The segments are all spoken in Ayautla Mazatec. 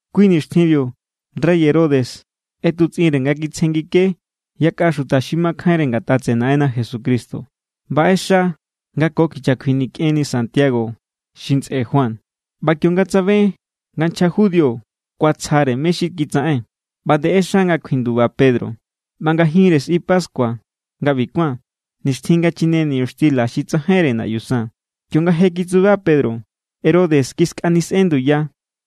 Kui nixtjinbiu rey Herodes ꞌetutsꞌinre nga kitsjengike yakꞌa xuta xi makjainre ngatꞌa tseꞌe Naꞌenna Jesucristo. ꞌBa ꞌexa nga ko kicha kjuinikꞌenni Santiago xi ntsꞌe Juan. ꞌBa kionga tsabe nga nchja judío kuatsjare mé= xi kitsaꞌen, ꞌba nde ꞌexa nga kjuinduba Pedro. ꞌBa ngajinre sꞌi pascua nga ꞌbi kuán, nixtjin nga chine niñuxtila xi tsajainre naꞌyu san. Kionga je kitsuba Pedro, Herodes kiskanisꞌen nduya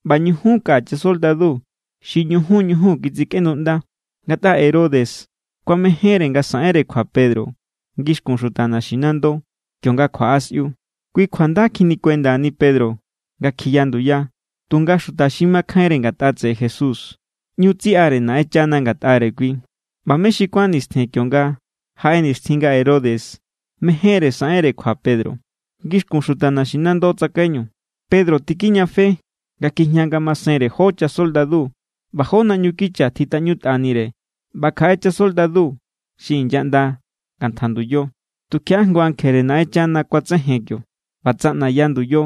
ꞌba ñujun kaꞌa chasoldadu xi ñujun ñujun kitsikꞌenduꞌnda. Ngatꞌa Herodes kuamejénre nga saꞌenre kjua Pedro ngixkun xuta naximando, kionga kjuaꞌa sꞌiu. Kui kjua nda kjinikuendani Pedro nga kjiya nduya, tunga xuta xi makjainre ngatꞌa tseꞌe Jesús ꞌñu tsiꞌare Naꞌenchana ngatꞌare kui. ꞌBa mé xi kuán nistjen kionga jaꞌe nixtjin nga Herodes mejénre saꞌenre kjua Pedro ngixkun xuta naxinando tsakaiñu, Pedro tikijñafe nga kjijña ngamasenre jó chasoldadu ꞌba jó naꞌñu kicha tjitꞌaꞌñutꞌanire ꞌba kjaꞌe chasoldadu xi inyaꞌnda ngantja nduyo. Tukjiaꞌa jngu ankjere Naꞌenchana kuatsejen kio ꞌba tsaꞌnaya nduyo,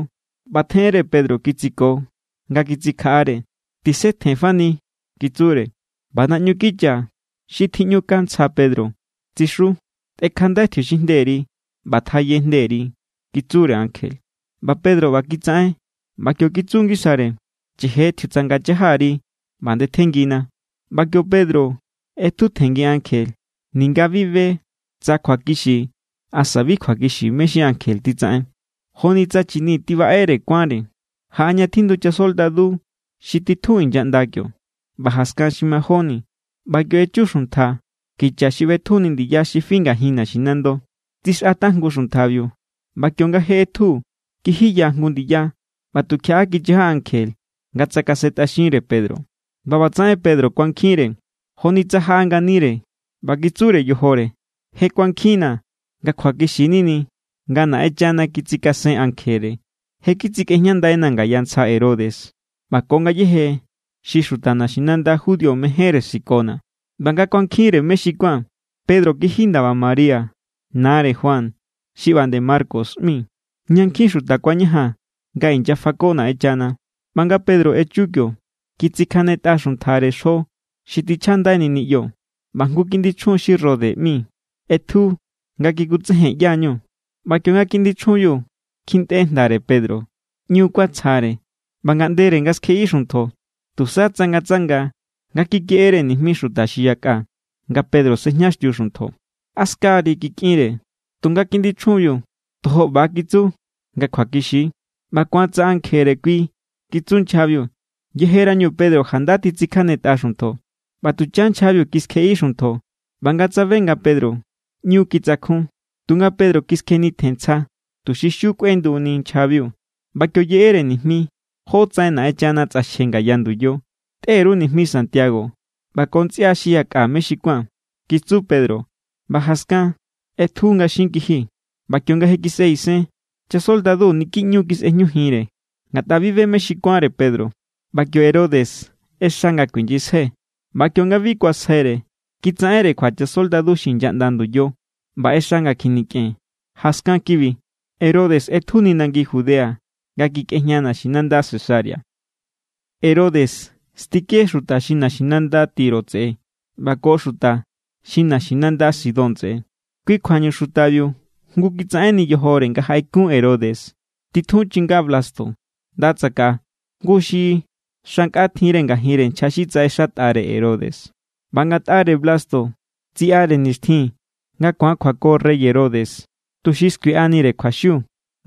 ꞌba tjeꞌenre Pedro kitsiko nga kitsikjaꞌare. —Tisetjen fani —kitsure. ꞌBa naꞌñu kicha xi tjiꞌñukja ntsja Pedro tsixu. —Tꞌekjandai tjiuxinjnderi ꞌba tjaye jnderi —kitsure ankje, ꞌba Pedro ꞌba kitsaꞌen. ꞌBa kio kitsu ngisare: —Cheje tjiutsanga chajari ꞌba ndetjenngina. ꞌBa kio Pedro ꞌetjutjenngi ankje ninga bi be tsa kjuakixi asa bi kjuakixi mé= xi ankje titsaꞌen. Joni tsa chini tibaꞌere kuánre. Jaꞌa ña tjindu chasoldadu xi titjun inyaꞌnda kio, ꞌba jaskan xi majóni. ꞌBa kio echu xuntja kicha xi ꞌbetjuni ndiya xi fi ngajin naxinando. Tsixꞌa tajngu xuntjabiu, ꞌba kionga je ꞌetju, kijiya jngu ndiya ꞌba tukjiaꞌa kichaja ankje nga tsakasentꞌaxinre Pedro. ꞌBa ꞌbatsaꞌen Pedro kuankjinre, joni tsa jaꞌa nganire ꞌba kitsure yojore: —Je kuankjinna̱ nga kjuakixi nini nga Naꞌenchana kitsikasen ankjere. Je kitsikꞌejñandaina̱ ngaya ntsja Herodes ꞌba ko ngayéje xi xuta naxinanda judío mejénre sikona̱. ꞌBa nga kuankjinre mé xi kuán, Pedro kiji ndaba María, nare Juan xi ꞌba nde Marcos ꞌmi, ꞌña nkjin xuta kuañajan nga inyafako Naꞌenchana. ꞌBa nga Pedro echu kio, kitsikjanetꞌa xuntjare xjo xi tichjandaini niꞌyo, ꞌba jngu kiꞌndi chjun xi Rode ꞌmi ꞌetju nga kikutsejen ꞌyá= ñu. ꞌBa kionga kiꞌndi chjunbiu kjintꞌe jndare Pedro, ꞌñu kuatsjare ꞌba ngaꞌndere nga skjeꞌi xuntjo, tusa tsangatsanga nga kikeꞌere nijmi xuta xi yakꞌa nga Pedro sejñaxtiu xuntjo. —A ska=ri —kikꞌinre. Tunga kiꞌndi chjunbiu tojo ꞌba= kitsu nga kjuakixi=. —ꞌBa ku̱an tsa ankjere kui —kitsu nchjabiu. Yejerañu Pedro janda titsikjanetꞌa xuntjo. ꞌBa tuchan nchjabiu kiskjeꞌi xuntjo ꞌba nga tsabe nga Pedro, ꞌñu kitsakjun. Tunga Pedro kiskjenitjen ntsja, tuxi xiu kꞌuenduni nchjabiu. ꞌBa kio yeꞌere nijmi jótsaꞌen Naꞌenchana tsꞌaxje ngaya nduyo. —Tꞌe_ru nijmi Santiago ꞌba ko ntsꞌia xi yakꞌa mé xi kuán —kitsu Pedro ꞌba jaskan ꞌetju nga xin kiji. ꞌBa kionga je kisꞌe isen, chasoldadu niki ꞌñu= kisꞌejñujinre, ngatꞌa bi be mé xi kuánre Pedro. ꞌBa kio Herodes ꞌexa nga kuinyisjai, ꞌba kionga bi kuasjaire, kitsaꞌenre kjua chasoldadu xi inyaꞌnda nduyo ꞌba ꞌexa nga kjinikꞌen. Jaskan kibi, Herodes ꞌetjuni nangi Judea nga kikꞌejña naxinanda Cesarea. Herodes stike xuta xi naxinanda Tiro tseꞌe ꞌba ko xuta xi naxinanda Sidón tseꞌe. Kui kjuañu xutabiu jngu kitsaꞌenni yojore nga jaꞌekun Herodes. Titjun chinga Blasto nda tsakaꞌa, jngu xi xa nkꞌa tjinre ngajinre nchja xi tsaꞌexatꞌare Herodes. ꞌBa ngatꞌare Blasto tsiꞌare nixtjin nga ku̱an kjuako rey Herodes, tuxi skuiꞌanire kjuaxiu,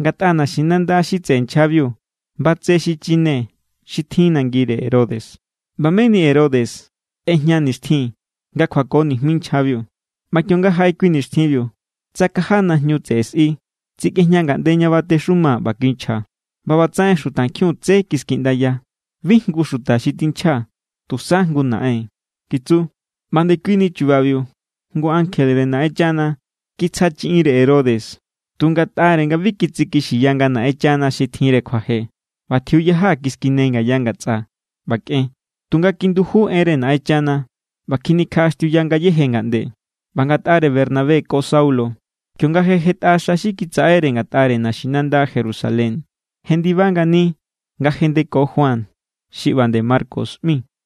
ngatꞌa naxinanda xi tseꞌe nchjabiu batse xi chine xi tjin nangire Herodes. ꞌBa meni Herodes ꞌejña nixtjin nga kjuako nijmi nchjabiu. ꞌBa kionga jaꞌe kui nixtjinbiu, tsakaja najñu tseꞌe sꞌi, tsikꞌejña ngaꞌnde ña batexuma ꞌba kinchja. ꞌBa ꞌbatsaꞌen xutankjiun tsé kiskiꞌndaya: —Bi jngu xuta xi tinchja, tusa jngu naꞌen —kitsu. ꞌBa ndekuini chubabiu, jngu ankjere Naꞌenchana kitsja chiꞌinre Herodes, tu ngatꞌare nga bi kitsikixiya nga Naꞌenchana xi tjinre kjuaje. ꞌBa tjiuyaja kiskine ngaya ngatsꞌa, ꞌba kꞌen. Tunga kinduju enre Naꞌenchana ꞌba kjinikjaꞌaxtiuya ngayéje ngaꞌnde. ꞌBa ngatꞌare Bernabé ko Saulo, kionga je jetꞌa xa xi kitsaꞌere ngatꞌare naxinanda Jerusalén, jendiba ngani nga jendeko Juan xi ꞌba nde Marcos ꞌmi.